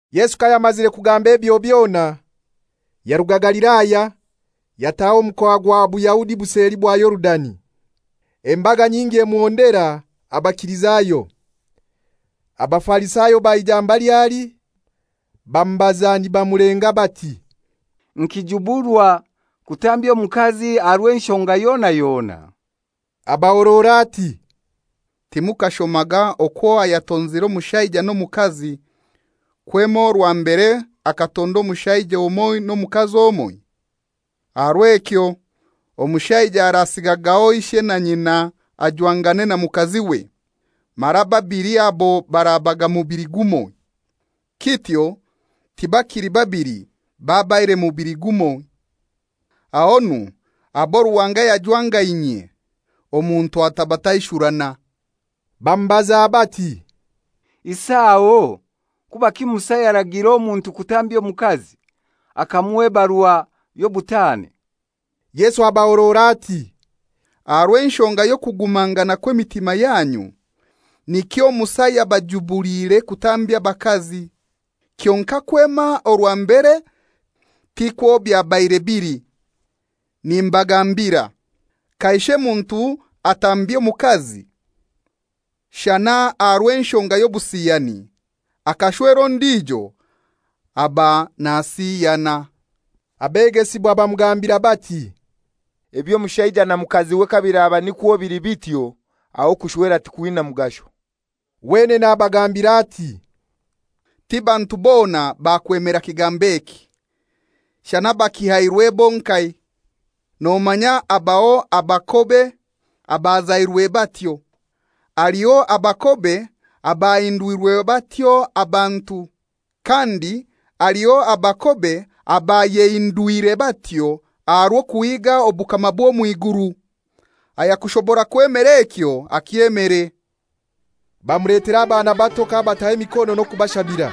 Yesu kayamazire kugamba ebyo byona, yaruga Galilaya, yataha omu mukoa gwa Buyahudi buseli bwa Yorudani. Embaga nyingi emuhondera, abakilizayo. Abafarisayo baija mbali ali, bamubaza nibamulenga bati, «Nikijuburwa kutambya omukazi aha rw'enshonga yona yona?» Abahorora ati, «Timukashomaga okwo ayatonzire omushaija n'omukazi kwema orwa mbere akatonda omushaija omoi n'omukazi omoi? Aha rw'ekyo omushaija arasigagaho ishe na nyina ajwangane na mukaziwe, mara ababili abo barabaga mubili gumoi. Kityo tibakili babili, babaire mubili gumoi. Ahonu abo Ruhanga yajwangainyie, omuntu atabataishurana.» Bamubaza bati, «Isi aho kubaki Musa yaragiire omuntu kutambya omukazi, akamuha ebarua y'obutaane?» Yesu abahorora ati, «Aha rw'enshonga y'okugumangana kw'emitima yanyu nikyo Musa yabajubuliire kutambya abakazi. Kyonkai kwema orwa mbere tikwo byabaire bili. Nimbagambira: Kaishe muntu atambya omukazi, shana aha rw'enshonga y'obusiyani, akashwera ondijo aba nasiyana.» Abegesibwa bamugambira bati, «Eby'omushaija na mukaziwe kabiraba nikwo bili bityo, aho okushwera tikwina mugasho.» Wenene abagambira ati, «Ti bantu bona bakwemera kigambo eki, shana abakihairwe bonkai. Nomanya abaho abakobe abazairwe batyo, haliho abakobe abahindwirwe batyo abantu, kandi haliho abakobe abayehindwire batyo aha rw'okuhiga obukama bw'omw'iguru. Ayakubasa kwemera ekyo akyemere.» Bamuletera abaana bato k'abataho emikono n'okubashabira.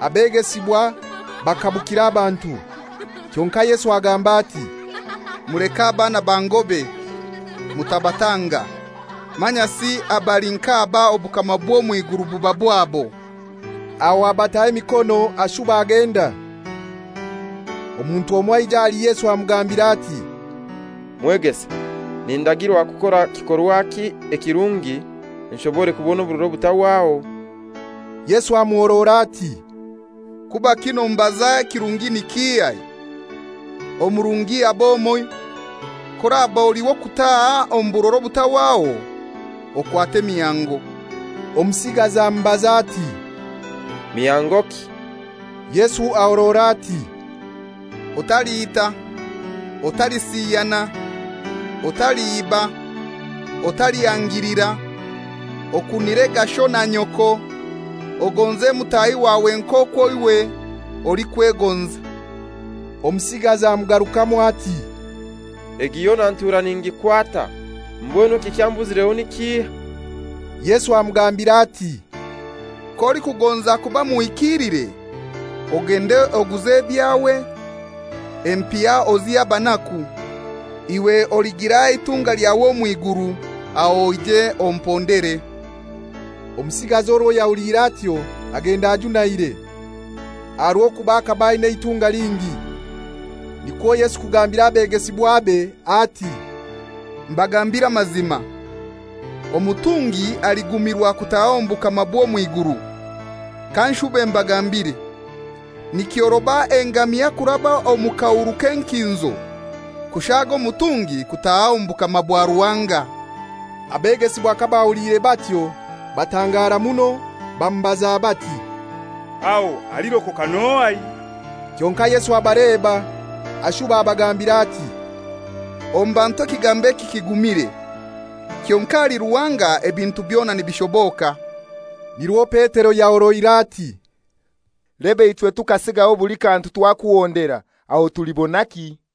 Abegesibwa bakabukira abantu; Kyonkai Yesu agamba ati, «Muleke abaana bangobe, mutabatanga; manyasi abali nk'aba obukama bw'omw'iguru buba bwabo.» Aho abataho emikono, ashuba agenda. Omuntu omoi aija ahali Yesu amugambira ati, «Mwegesa, nindagirwa kukora kikorwaki ekirungi, nshobore kubona oburora obutahwaho?» Yesu amuhorora ati, «Kubaki nombaza ekirungi ni kihai? Omurungi ab'omoi. K'oraba oli w'okutaha omu burora obutahwaho, okwate emihango.» Omusigazi amubaza ati, «Mihangoki?» Yesu ahorora ati, «Otaliita, Otalisiyana, Otaliiba, Otalihangilira; Okunirega sho na nyoko, Ogonze mutahi wawe nk'okwo iwe olikwegonza.» Omusigazi amugarukamu ati, «Egi yona ntura ningikwata. Mbwenu ekikyambuzireho ni kihai?» Yesu amugambira ati, «K'olikugonza kuba muhikiilire, ogende oguze ebyawe, empiha ozihe abanaku, iwe oligira eitunga elyawe omw'iguru; aho oije ompondere.» Omusigazi orwo yahuliire atyo agenda ajunaire, aha rw'okuba akaba aina eitunga lingi. Nikwo Yesu kugambira abegesibwabe ati, «Mbagambiire amazima, omutungi aligumirwa kutaha omu bukama bw'omw'iguru. Kanshube mbagambire: Nikyoroba engamia kuraba omu kahuru k'enkinzo, kushaga omutungi kutaha omu bukama bwa Ruhanga.» Abegesibwa kabahuliire batyo batangara muno, bamubaza bati, «Aho alirokoka n'ohai?» Kyonkai Yesu abaleba, ashuba abagambira ati, «Omu bantu ekigambo eki kigumire; kyonkai ahali Ruhanga ebintu byona nibishoboka.» Nirwo Petero yahoroire ati, «Leba ichwe tukasigaho buli kantu twakuhondera. Aho tulibonaki?»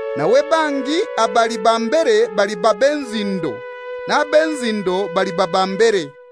Nawe bangi abali ba mbere baliba b'enzindo, n'ab'enzindo baliba ba mbere.»